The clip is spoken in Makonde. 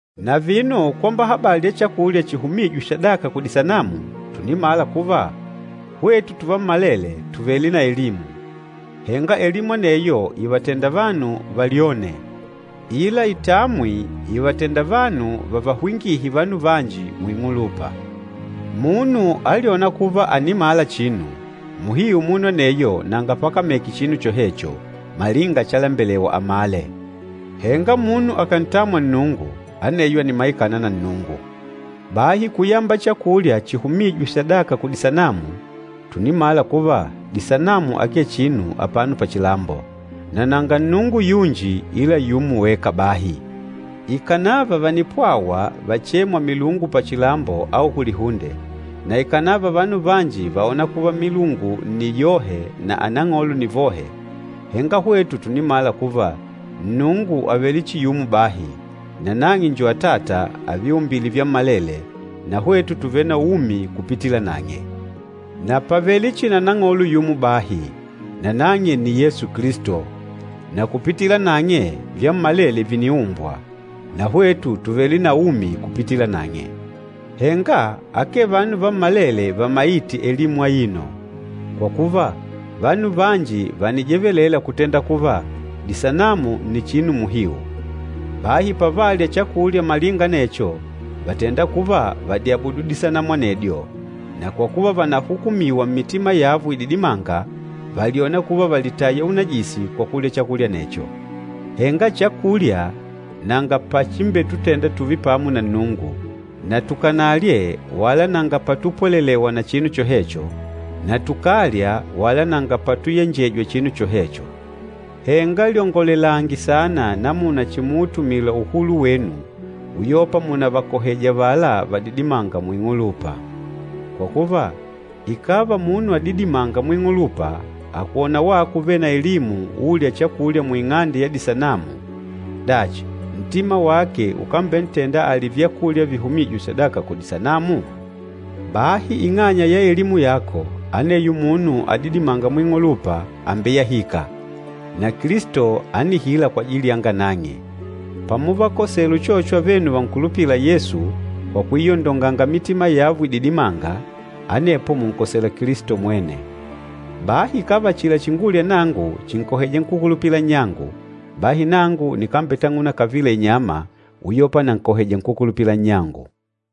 Na vino kwamba habali ya chakulya chihumîjwe sadaka kudisanamu, tùnimala kuva, hwetu tuvammalele tùvele na elimu, henga elimu aneyo ìvatenda vanu valyone, ila itamwi ìvatenda vanu vavahwingihe vanu vanji muing'ulupa. Munu alyôna kuva ànimala chinu, muhiu munu aneyo nanga pakameke chinu chohecho malinga chalembelewa amale. Henga munu akàntamwa Nnungu, aneyo ànimaikana na Nnungu. Bahi kuyamba chakulya chihumîjwe sadaka kudisanamu, tùnimala kuva disanamu akee chinu apano pachilambo, na nanga Nnungu yunji ila yumo weka bahi. Ikànava vànipwawa vachêmwa milungu pachilambo au kulihunde, na ikànava vanu vanji vàona kuva milungu nni yohe na anang'olo ni vohe, henga hwetu tùnimala kuva Nnungu àvele chihi yumo bahi, nanang'e njo Atata, aviumbîle vyammalele, na hwetu tùvele na umi kupitila nang'e. Na pàvele chihi na Nang'olo yumo bahi, nanang'e nni Yesu Kilisto, na kupitila nang'e vyammalele vìniumbwa, na hwetu tùvele na umi kupitila nang'e. Henga, akee vanu vammalele vamaîte elimu aino. Kwa kuva, vanu vanji vànijevelela kutenda kuva, disanamu nni chinu muhiu. Bahi pavalya chakulya malinga anecho, vàtenda kuva vàdiabudu disanamu anedyo, na kwa kuva vànahukumiwa mmitima yavo ididimânga, vàlyona kuva vàlitaya unajisi kwa kulya chakulya anecho. Henga chakulya nanga pachimbetutenda tùùve pamo na Nnungu, na tukanalye wala nanga patupwelelewa na chinu chohecho, na tukàlya wala nanga patuyenjejwa chinu chohecho. Henga lyongolelange saana namuna chimuutumila uhulu wenu uyopa munavakoheja avala vadidimânga muing'ulupa. Kwa kuva, ikàva munu adidimânga muing'ulupa akàkwona wako uvêle na elimu ùùlya chakulya muing'ande ya disanamu, dachi, ntima wake ukambentenda alye vyakulya vihumîjwe sadaka kudisanamu? Bahi ing'anya ya elimu yako, aneyo munu adidimânga muing'ulupa àmbeyahika, na Kilisto ánihila kwajili yanga nang'e. Pamuvakosela uchocho avenu vankulupîla Yesu kwa kuiondonganga mitima yavo ididimânga, anepo mùnkosela Kilisto mwene. Bahi ikàva achila chingulya nangu chìnkoheja nkúkulupila nnyangu, bahi nangu nikambetang'una kavila inyama, uyopa nankoheja nkúkulupila nnyangu.